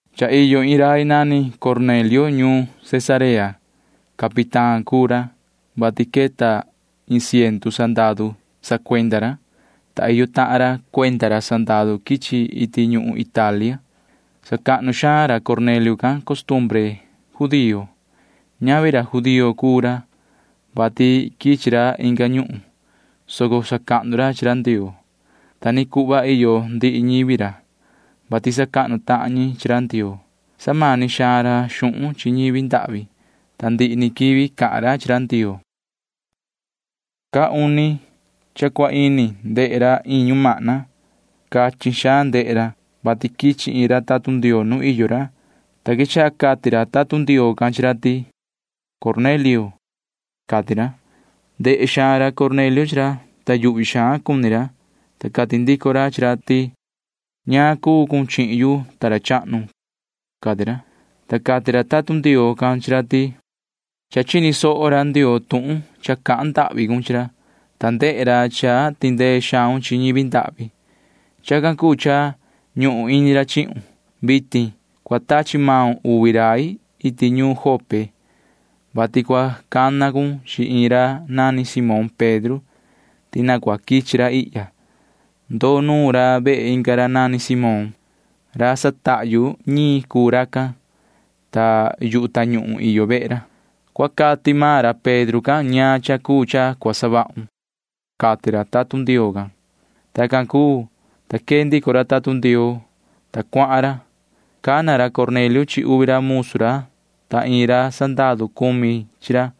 Cha iyo iin rai nani Cornelio ñuun Cesarea. Capitán cuu ra, vati queta iin ciendu sandaru sacuenda ra, ta iyo tahan ra cuenda ra sandaru quichi iti ñuhun Italia. Sacahnu xaan ra Cornelio can costumbre judío. Ñavi ra judío cuu ra, vati quichi ra inga ñuhun, soco sacahnu ra chi ra Ndioo. Ta ni cuhva iyo ndihi ñivi ra, vati sacahnu tahan ñi chi ra Ndioo. Samani xaan ra xuhun chi ñivi ndahvi, ta ndihi ni quivi cahan ra chi ra Ndioo. Caa uni cha cua ini ndehe ra iin ñumahna. Cachin xaan ndehe ra, vati quichi iin ra tatun Ndioo nu iyo ra, ta quechaha cati ra tatun Ndioo can chi ra ti: ―Yoho Cornelio ―cati ra. Ndehe xaan Cornelio chi ra, ta yuhvi xaan cuni ra, ta cati ndico ra chi ra ti: ―¿Ñaan cuu cun chihin yu, ta ra chahnu? ―cati ra. Ta cati ra tatun Ndioo can chi ra ti: ―Cha chini soho ra Ndioo tuhun cha cahan ndahvi cun chi ra, ta ndehe ra cha tindee xaun chi ñivi ndahvi. Chacan cuu cha ñuhun ini ra chihun. Vitin cua tachi maun uvi rai iti ñuun Jope, vati cua cana cun chi iin ra nani Simón Pedro ti na cua quichi ra ihya. Ndoo nuun ra vehe inga ra nani Simón. Ra satahyu ñiin cuu racan, ta yu tañuhun iyo vehe ra. Cua cati maan ra Pedro can ñaan cha cuu cha cua savahun ―cati ra tatun Ndioo can. Tacan cuu, ta quee ndico ra tatun Ndioo, ta cuahan ra. Cana ra Cornelio chi uvi ra musu ra ta iin ra sandaru cumi chi ra.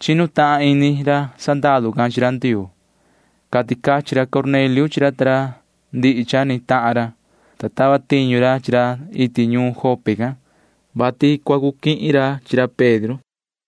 Chinu tahan ini ra sandaru can chi ra Ndioo. Cati cachin ra Cornelio chi ra ta ra ndihi cha ni tahan ra, ta tava tiñu ra chi ra iti ñuun Jope can, vati cua cu quihin ra chi ra Pedro.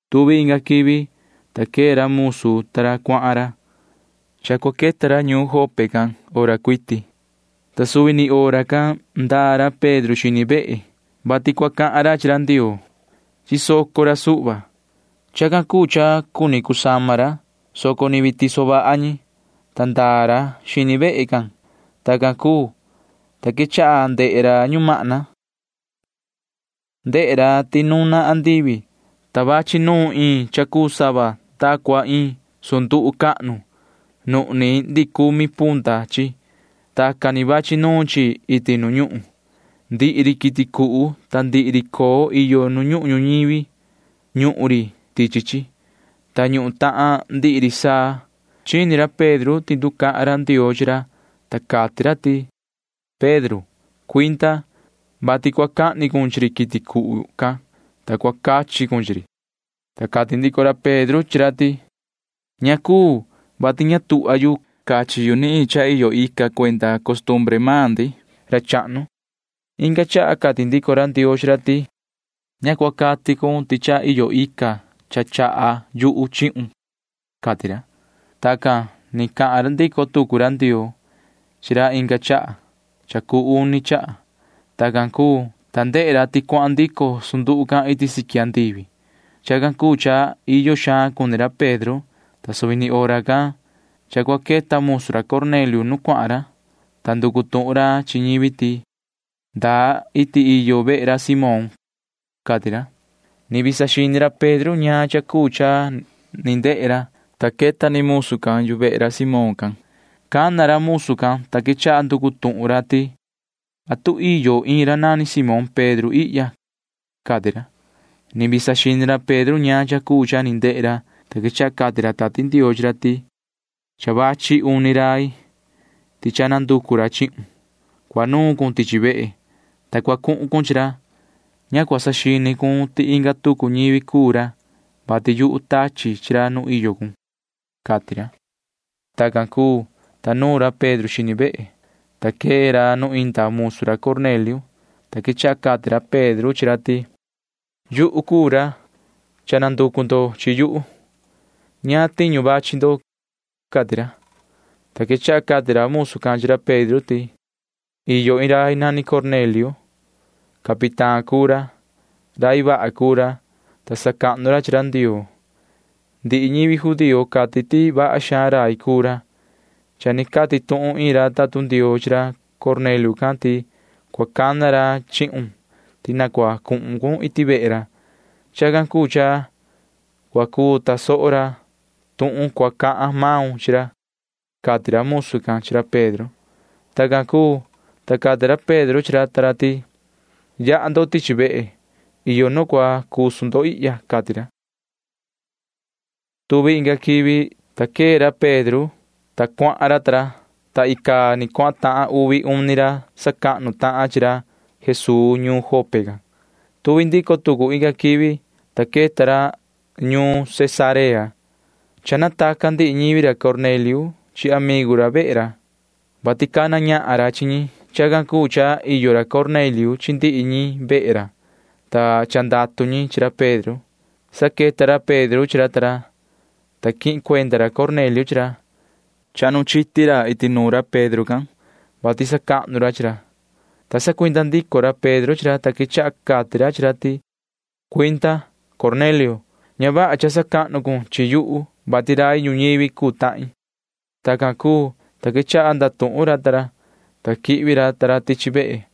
Tuvi inga quivi, ta quee ra musu ta ra cuahan ra. Cha cua queta ra ñuun Jope can maan hora, ta suvi ni hora can ndaa ra Pedro xini vehe, vati cua cahan ra chi ra Ndioo. Chisoco ra suhva. Chacan cuu cha cuni cusama ra, soco ni vii tiso vaha ñi, ta ndaa ra xini vehe can. Tacan cuu, ta quechaha ndehe ra ñumahna. Ndehe ra ti nuna andivi, ta vachi nuun iin cha cuu sava ta cua iin sunduhu cahnu. Nuhni ndihi cumi punta chi. Tacan ni vachi nuun chi iti nu ñuhun. Ndihi ri quiti cuhu ta ndihi ri coo iyo nu ñuhun ñuñivi―ñuhun ri tichi chi, ta ñuhun tahan ndihi ri saa. Chini ra Pedro ti nducahan ra Ndioo chi ra, ta cati ra ti: ―Yoho Pedro, cuinda, vati cua cahni cun chi ri quiti cuhu can, ta cua cachi cun chi ri. Ta cati ndico ra Pedro chi ra ti: ―Ña cuu, vati ña tuhva yu cachi yu ni iin cha iyo ica cuenda costumbre maan ndi, ra chahnu. Inga chaha cati ndico ra Ndioo chi ra ti: ―Ña cua cati cun ti cha iyo ica cha chaha yuhu chihun ―cati ra. Tacan ni cahan ndico tucu ra Ndioo chi ra inga chaha cha cuu uni chaha. Tacan cuu, ta ndehe ra ti cuahan ndico sunduhu can iti siqui andivi. Chacan cuu cha iyo xaan cuni ra Pedro, ta suvi ni hora can cha cua queta musu ra Cornelio nu cuahan ra, ta nducu tuhun ra chi ñivi ti: ―¿Ndaa iti iyo vehe ra Simón? ―cati ra. Ni vii saxini ra Pedro ñaan cha cuu cha ni ndehe ra, ta queta ni musu can yu vehe ra Simón can. Cana ra musu can, ta quechaha nducu tuhun ra ti: ―¿Atu iyo iin ra nani Simón Pedro ihya? ―cati ra. Ni vii saxini ra Pedro ñaan cha cuu cha ni ndehe ra, ta quechaha cati ra Tati Ndioo chi ra ti: ―Cha vachi uni rai, ti cha nanducu ra chihun. Cua nuun cun tichi vehe, ta cua cuhun cun chi ra. Ña cua saxini cun ti inga tucu ñivi cuu ra, vati yuhu tachi chi ra nu iyo cun ―cati ra. Tacan cuu, ta nuun ra Pedro xini vehe, ta queta ra nu inda musu ra Cornelio, ta quechaha cati ra Pedro chi ra ti: ―Yuhu cuu ra. Cha nanducu ndo chi yuhu. ¿Ñaan tiñu vachi ndo? ―cati ra. Ta quechaha cati ra musu can chi ra Pedro ti: ―Iyo iin rai nani Cornelio. Capitán cuu ra. Rai vaha cuu ra, ta sacahnu ra chi ra Ndioo. Ndihi ñivi judío cati ti vaha xaan rai cuu ra. Cha ni cati tuhun iin ra tatun Ndioo chi ra Cornelio can ti cua cana ra chihun ti na cua cuhun cun iti vehe ra. Chacan cuu cha cua cuu tasoho ra tuhun cua cahan maun chi ra ―cati ra musu can chi ra Pedro. Tacan cuu, ta cati ra Pedro chi ra ta ra ti: ―Yaha ndo tichi vehe. Iyo nu cua cusu ndo ihya ―cati ra. Tuvi inga quivi, ta quee ra Pedro ta ra, ta cuahan ra, ta icaa ni cuahan tahan uvi uni ra sacahnu tahan chi ra Jesuu ñuun Jope can. Tuvi ndico tucu inga quivi, ta queta ra ta ra ñuun Cesarea. Cha nataca ndihi ñivi ra Cornelio chi amigu ra vehe ra, vati cana ñahan ra chi ñi. Chacan cuu cha iyo ra Cornelio chi ndihi ñi vehe ra, ta cha ndatu ñi chi ra Pedro. Sa queta ra Pedro chi ra ta ra, ta quihin cuenda ra Cornelio chi ra. Chahnu chiti ra iti nuun ra Pedro can, [vati sacahnu ra chi ra,] ta sacuinda ndico ra Pedro chi ra, ta quechaha cati ra chi ra ti: ―Cuinda, Cornelio. Ña vaha cha sacahnu cun chihin yu, vati rai ñuñivi cuu tahin. Tacan cuu, ta quechaha ndatuhun ra ta ra, ta quihvi ra ta ra tichi vehe.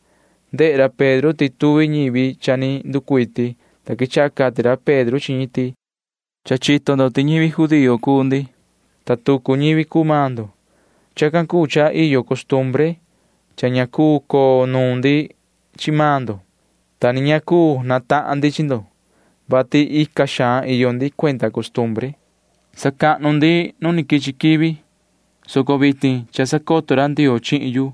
Ndehe ra Pedro ti tuvi ñivi cha ni nducuiti, ta quechaha cati ra Pedro chi ñi ti: ―Cha chito ndo ti ñivi judío cuu ndi, ta tucu ñivi cuu maan ndo. Chacan cuu cha iyo costumbre cha ña cuu coo nuun ndi chi maan ndo, ta ni ña cuu natahan ndi chi ndo, vati ica xaan iyo ndi cuenda costumbre sacahnu ndi nu quichi quivi, soco vitin cha sacoto ra Ndioo chihin yu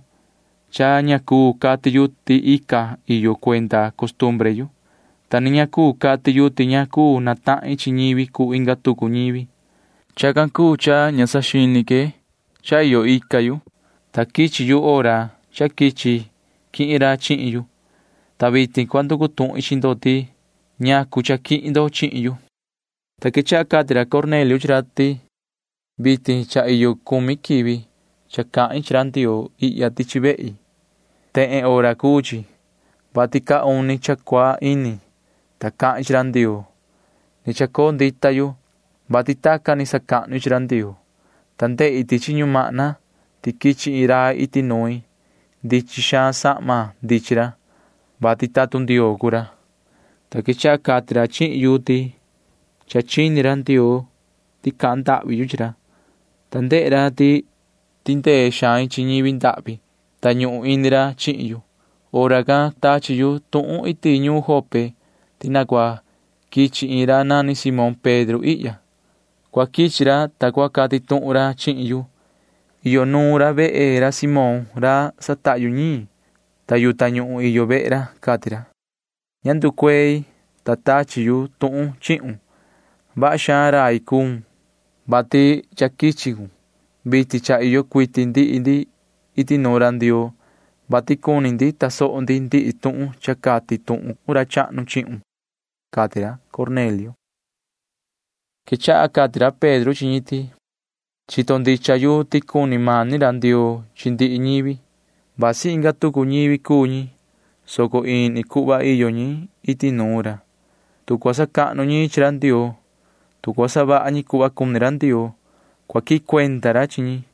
cha ña cuu cati yu ti ica iyo yu cuenda costumbre yu, ta ni ña cuu cati yu ti ña cuu natahin chi ñivi cuu inga tucu ñivi. Chacan cuu cha ña saxini que cha iyo ica yu, ta quichi yu hora cha quichi quihin ra chihin yu, ta vitin cua nducu tuhin chi ndo ti: “¿Ñacu cha quihin ndo chihin yu?” Ta quechaha cati ra Cornelio chi ra ti: ―Vitin cha iyo cumi quivi cha cahin chi ra Ndioo ihya tichi vehi. Tehen hora cuu chi, vati caa uni cha cua ini, ta cahin chi ra Ndioo. Ni chacoo ndita yu, vati tacan ni sacahnu i chi ra Ndioo, ta ndehi tichi ñumahna ti quichi iin rai iti nuin. Ndichin xaan sahma ndichin ra, vati tatun Ndioo cuu ra, ta quechaha cati ra chihin yu ti cha chini ra Ndioo ti cahan ndahvi yu chi ra, ta ndehe ra ti tindee xain chi ñivi ndahvi, ta ñuhun ini ra chihin yu. Hora can cua tachi yu tuhun iti ñuun Jope ti na cua quichi iin ra nani Simón Pedro ihya. [Cua quichi ra, ta cua cati tuhun ra chihin yu.] Iyo nuun ra vehe ra Simón ra satahyu ñiin, ta yu tañuhun iyo vehe ra, cati ra. Ña nducuei, ta tachi yu tuhun chihun. Vaha xaan rai cuun, vati cha quichi cun. Vitin cha iyo cuiti ndihi ndi iti nuun ra Ndioo, vati cuni tasoho ndi ndihi tuhun cha cati tuhun ra chahnu chihun ―cati ra Cornelio. Quechaha cati ra Pedro chi ñi ti: ―Chito ndicha yu ti cuni mani ra Ndioo chi ndihi ñivi. Vasi inga tucu ñivi cuu ñi, soco ini cuhva iyo ñi iti nuun ra. Tu cua sacahnu ñi chi ra Ndioo, tu cua savaha ñi cuhva cuni ra Ndioo, cua quihin cuenda ra chi ñi.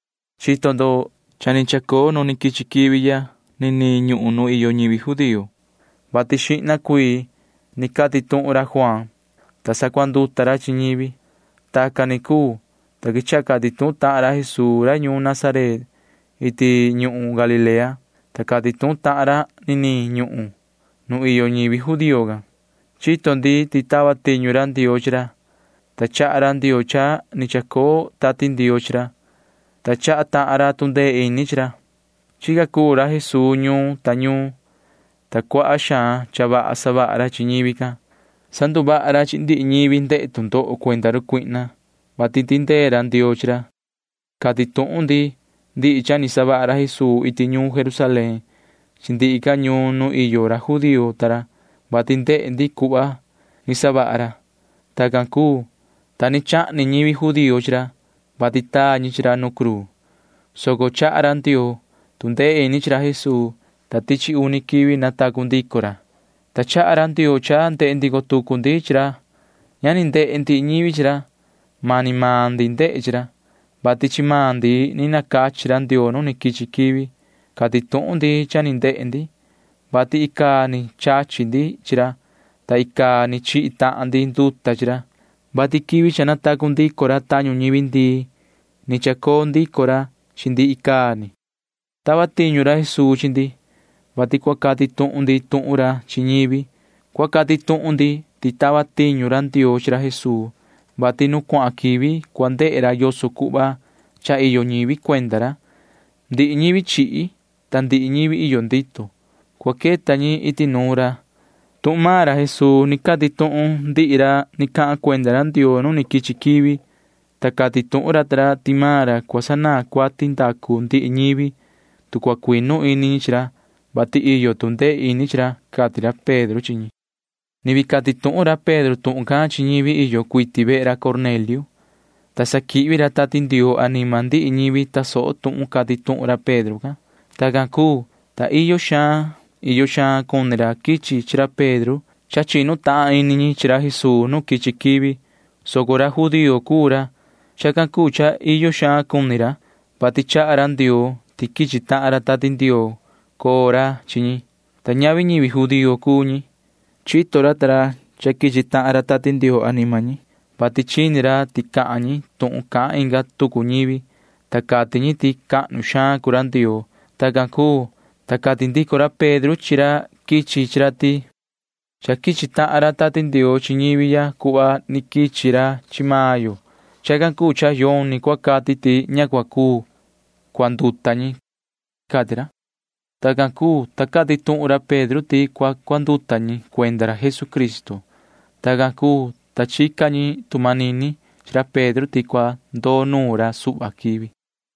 Chito ndo cha ni chacoo nu quichi quivi ya niniin ñuhun nu iyo ñivi judío, vati xihna cuii ni cati tuhun ra Juaan, ta sacuanduta ra chi ñivi. Tacan ni cuu, ta quechaha cati tuhun ra Jesuu ra ñuun Nazaret iti ñuhun Galilea, ta cati tuhun tahan ra niniin ñuhun nu iyo ñivi judío can. Chito ndi ti tava tiñu ra Ndioo chi ra, ta chaha ra Ndioo cha ni chacoo Tati Ndioo chi ra, ta chaha tahan ra tu ndee ini chi ra. Chica cuu ra Jesuu ñuun ta ñuun, ta cuaha xaan cha vaha savaha ra chi ñivi can. Sanduvaha ra chi ndihi ñivi ndehe tu ndoho cuenda run cuihna, vati tindee ra Ndioo chi ra. Cati tuhun ndi ndihi cha ni savaha ra Jesuu iti ñuun Jerusalén chi ndihi ca ñuun nu iyo ra judío ta ra, vati ndehe ndi cuhva ni savaha ra. Tacan cuu, ta ni chahni ñivi judío chi ra, vati taa ñi chi ra nu cruu, soco chaha ra Ndioo tu ndee ini chi ra Jesuu, ta tichi uni quivi natacu ndico ra, ta chaha ra Ndioo cha ndehe ndico tucu ndi chi ra. Ña ni ndehe ndihi ñivi chi ra. Mani maan ndi ndehe chi ra, vati chi maan ndi ni nacachi ra Ndioo nu quichi quivi. Cati tuhun ndi cha ni ndehe ndi, vati icaa ni chachi ndi chi ra, ta icaa ni chihi tahan ndi nduta chi ra, vati quivi cha natacu ndico ra tañu ñivi ndii ni chacoo ndico ra chi ndi icaa ni. Tava tiñu ra Jesuu chi ndi, vati cua cati tuhun ndi tuhun ra chi ñivi. Cua cati tuhun ndi ti tava tiñu ra Ndioo chi ra Jesuu, vati nu cuahan quivi cua ndehe ra yoso cuhva cha iyo ñivi cuenda ra. Ndihi ñivi chihi ta ndihi ñivi iyo ndito―cua queta ñi iti nuun ra. Tuhun maan ra Jesuu ni cati tuhun ndihi ra ni cahan cuenda ra Ndioo nu ni quichi quivi, ta cati tuhun ra ta ra ti maan ra cua sanaan cuati ndacu ndihi ñivi, tu cua cuinu ini ñi chi ra, vati iyo tu ndee ini chi ra ―cati ra Pedro chi ñi. Ni vii cati tuhun ra Pedro tuhun can chi ñivi iyo cuiti vehe ra Cornelio, ta sa quihvi ra Tati Ndioo anima ndihi ñivi tasoho tuhun cati tuhun ra Pedro can. Tacan cuu, ta iyo xaan iyo xaan cuni ra quichi chi ra Pedro. Cha chinu tahan ini ra chi ra Jesuu nu quichi quivi, soco ra judío cuu ra. Chacan cuu cha iyo xaan cuni ra, vati chaha ra Ndioo ti quichi tahan ra Tati Ndioo coo ra chi ñi, ta ñavi ñivi judío cuu ñi. Chito ra ta ra cha quichi tahan ra Tati Ndioo anima ñi, vati chini ra ti cahan ñi tuhun cahan inga tucu ñivi, ta cati ñi ti cahnu xaan cuu ra Ndioo. Tacan cuu, ta cati ndico ra Pedro chi ra quichi chi ra ti: ―Cha quichi tahan ra Tati Ndioo chi ñivi ya cuhva ni quichi ra chi maan yo. Chacan cuu cha yoni cua cati ti ña cua cuu cuanduta ñi ―cati ra. Tacan cuu, ta cati tuhun ra Pedro ti cua cuanduta ñi cuenda ra Jesucristo. Tacan cuu, ta chica ñi tu manini chi ra Pedro ti cua ndoo nuun ra suhva quivi.